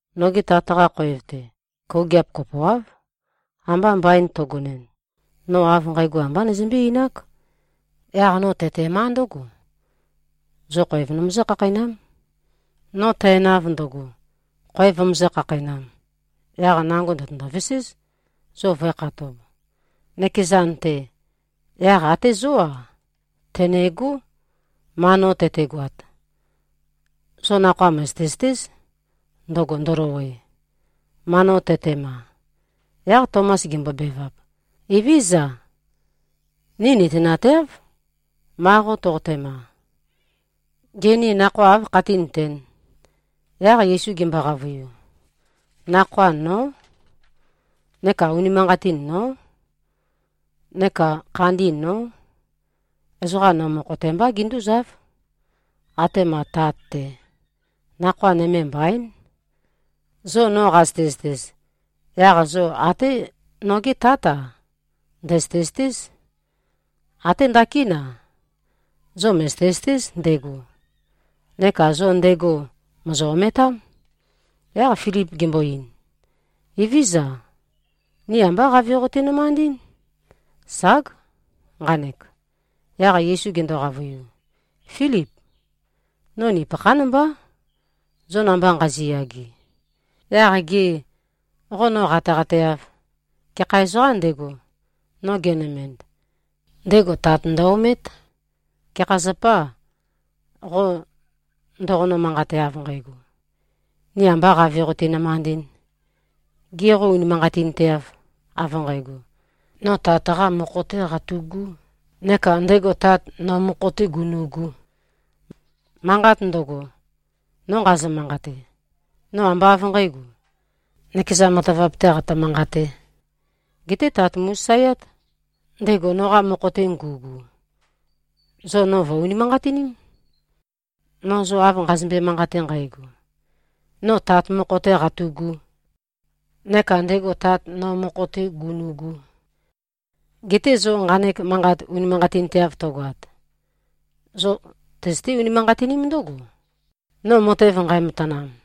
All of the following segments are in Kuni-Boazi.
Noge Tat-qa khoev-te, kougiap kopoáv. Amba mbain tøgonɨn, no av nqægo ambá nøzømbé-einák. Yaq no tøtemá ndǿgo, zo khoev nomøzǿ-khakheinám. No tænav ndøgo, khoev vømøzǿ-khakheinām, yaq nango ndø̀tøndo-veséz, zo vǿekhatōb, nøkezan-te. Yaq até zó-a, tø̀negó, ma no tøtegoat. Zo nakhoa mø̀zøte-zøtéz, ndøgo ndølowe, ma no tøtema.” Yaq Tomas gembobevap, “Evézøza, ni nøtenateáv, ma qo toqotema. Gê, ni nakhoa áv khatínøtēn?” Yaq Yesu gembo-qavøiu, “Nakhoa, nó. Neka unimanqatin, nó. Neka khandi, nó. Ezoqa no mokho-te mbá, gindúzáv, atema Tat-te. Nakhoa nøme mbaín. Zo no qazøte-zøtez, yaq zo até nogé Tát-a, ndø̀zøte-zøtéz. Até ndakín-a, zo mø̀zøte-zøtéz ndego. Neka zo ndego mòzo-ometám.” Yaq Filip gembo-ein, “Evézøza. Ni ambá Qave qoti-nømandɨ́n. Ság, nqanek.” Yaq Yesu gendo-qavøiu, “Fílip. No nupøkhán mbá, zo namba nqaziyage. Yaq gê, qo no qateqateâv? Gekha ezoqām ndego, no genømend, ndego Tat ndø-omét. Gekha zapâ, qo no ndoqonø-manqate, av nqægo, ‘Ni ambā Qave qoti-nømandɨ̄n?’ Gê, qo unimanqatinteâv, av nqægo, no Tat-qā mokho-tē qatu꞉gū neka ndego Tat, no mokho-tē gunu꞉gū? Manqat ndøgo, no nqazø-manqate, no ambá av nqǣgo, nøkeza matavap-tē qatø-manqatē. Geté Tat mu꞉sasaeát, ndego noqa mokho-te ngu꞉gu. Zo no vø̀-unimanqatiním, no zo av nqazømbe-manqate nqægo, no Tat mokho-tē qatu꞉gū, neka ndego Tat, no mokho-tē gunu꞉gū. Geté zo nqanek manqat unimanqatinteav tøgoat, zo tøzøté-unimanqatiním ndǿgo, no matev nqæmatanam.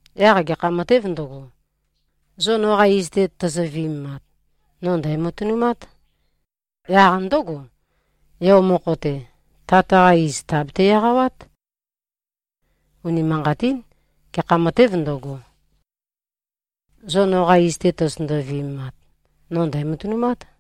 Yaq gekha matēv ndøgo, zo noqa iz-te tozo-viømemat, no ndæ̀matønumát. Yaq ndǿgo, Yo mokho-te, Tat-qa iz tàbete-eqawát. Unimanqatín. Gekha matēv ndøgo, zo noqa iz-te tozotøndo-viømemat, no ndæ̀matønumát.”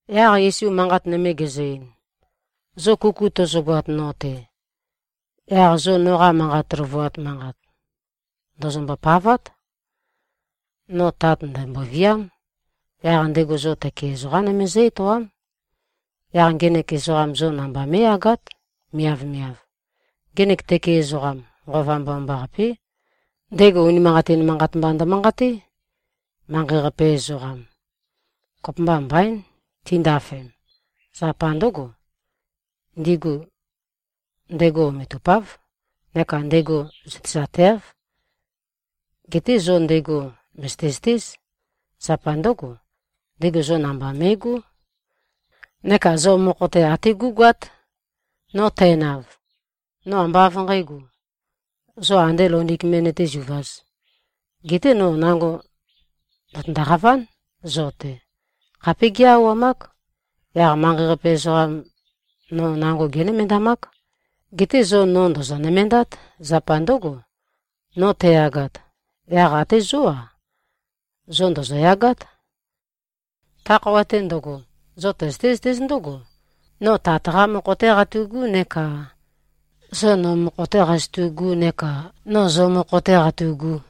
Yaq Yesu manqat nøme gezø-ein, “Zo kuku tøzøgoat no-te, yaq zo noqa manqa løvuat manqat ndòzombo-pavát. No Tat ndæ̀mboviám. Yaq ndego zo tøke ezoqam nøme zǿ-etoám. Yaq ngenek zo namba mé꞉yagát, miavmiav. Ngenek tøke ezoqam, Nqova Mbomambaqapé. Ndego unimanqatin manqat mba ndømanqaté. Manqei-qape ezoqam, kopømba mbaín, tindafem. Zapa ndǿgo, ndigu ndego ometupáv neka ndego zøtezateáv. Geté zo ndego mø̀zøte-zøtéz. Zapa ndǿgo, ndego zo namba me꞉gó neka zo mokho-te até gú꞉goát. No tænav, no ambá av nqǣgo, zo andē loundik me nøtézuvāz. Geté no nango ndø̀tøndoqaván, zo-te. Khapé gé꞉-auwamák. Yaq manqei-qape ezoqam no nango génømendamák. Geté zo no ndòzo-nømendát. Zapa ndǿgo, no tæyagat, yaq até zó-a, zo ndòzoyagát. Ta khøuwa-te ndøgo, zo tøzøté-zøtéz ndǿgo, no Tat-qā mokho-tē qatu꞉gū neka zo no mokho-tē qazotu꞉gū neka no zo mokho-tē qatu꞉gū.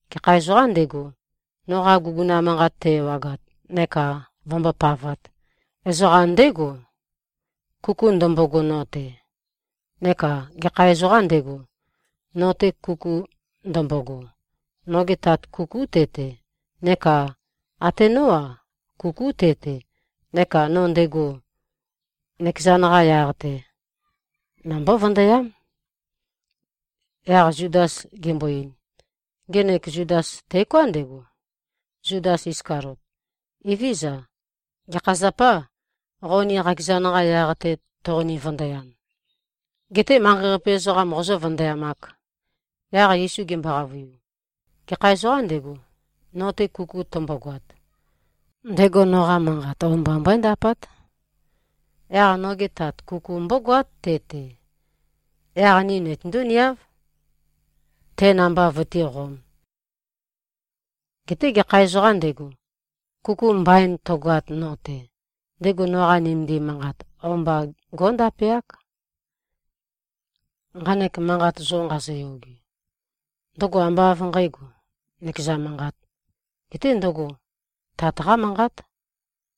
Gekha ezoqām ndego, noqa guguna manqat te-ewagat neka vømbópavāt, ezoqam ndégo, kuku ndømbogo no-te. Neka gekha ezoqām ndego, no-te kuku ndømbogo, noge Tat kukú te-te. Neka até nó-a, kukú te-te. Neka no ndego, nøkezan-qa yaq-te, nombó-vøndøyám.” Yaq Zudas gembo-ein, (ngenek Zudas teoká ndego, Zudas Iskaliot), “Evézøza, gekha zapâ, qo ni qakezan-qa yaq-te toqoni-vøndøyam, getē manqei-qape ezoqam qozø̄-vøndøyamāk?” Yaq Yesu gembo-qavøiu, “Gekha ezoqām ndego, no-te kuku tømbogoat, ndego noqa manqat o-mba mbøéndapát. Yaq noge Tat kuku mbógoát te-te. Yaq ni nitøndú-niáv, te namba vøtíqōm. Geté gekha ezoqām ndego, kuku mbain tøgoat no-te, ndego noqa nømendim manqat, o-mba gó꞉ndapeák. Nqanek manqat zo nqazoyoge, ndøgo ambá av nqǣgo, nøkeza manqāt, geté ndøgo Tat-qá manqát,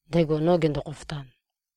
ndego no gendo-khofotan.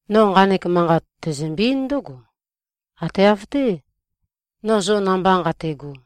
No nqanek manqat, tæzømbe-eín ndǿgo, ate av-té, no zo namba nqate꞉go.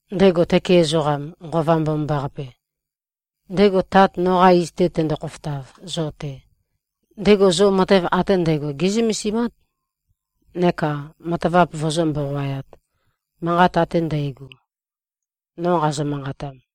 Ndego tøke ezoqam, Nqova Mbomambaqape, ndego Tat noqa iz-te tendo-khofotav zo-te, ndego zo matev ate ndægo gé꞉zømesimát neka matavap vøzǿ-mboqoayāt, manqat ate ndægo, no qazø-manqatam.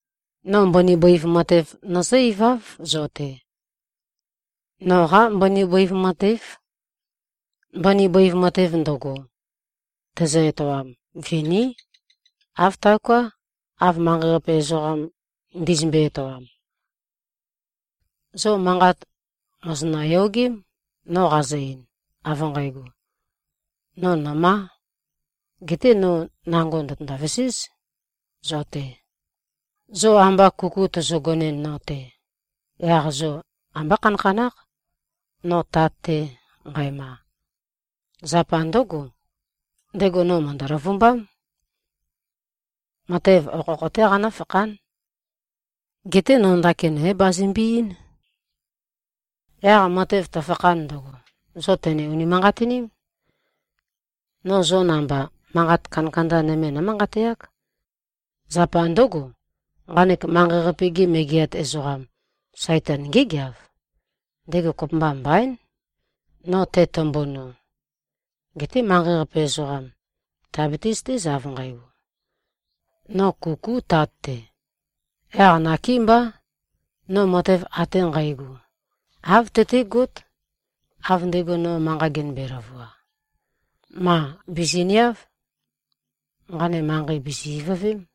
No mbøni bøiv matev nøzǿ-iváv zo-te. Noqá mbøni bøiv matév. Mbøni bøiv matev ndøgo, tæzø-etoam, viní. Āv taoká, av manqei-qape ezoqam ndizømbe-etoam. Zo manqat mòzonø-yogém, no qazø-ein, av nqægo, ‘No nø̀má. Geté no nango ndø̀tøndo-veséz zo-te.’ Zo amba kuku tøzøgonɨn, no-te, yaq zo ambá khanakhanákh, no Tat-te nqæma. Zapa ndǿgo, ndego no mø̀ndø-løvumbám. Matev okhokho-té qanǿfakhán. Geté no ndakin é-bazømbe-eín. Yaq matev tøfakhan ndøgo, zo tø̀ne-unimanqatiním. No zo namba, manqat kandakanda nøme nómanqateák. Zapa ndǿgo, nqanek manqei-qape-ge megeat ezoqam, Saitan, ngégeav. Ndego kopømba mbaín, no tetømbuno. Geté manqei-qape ezoqam, tìabiti-zøtéz, av nqægo, no kukú Tat-te. Yaq nakémbá, no matev ate nqægo, āv tøtégót, av ndego no manqa genømbe-løvua. Mā. Bìziniáv. Nqane manqei bìzi-ivøvém.”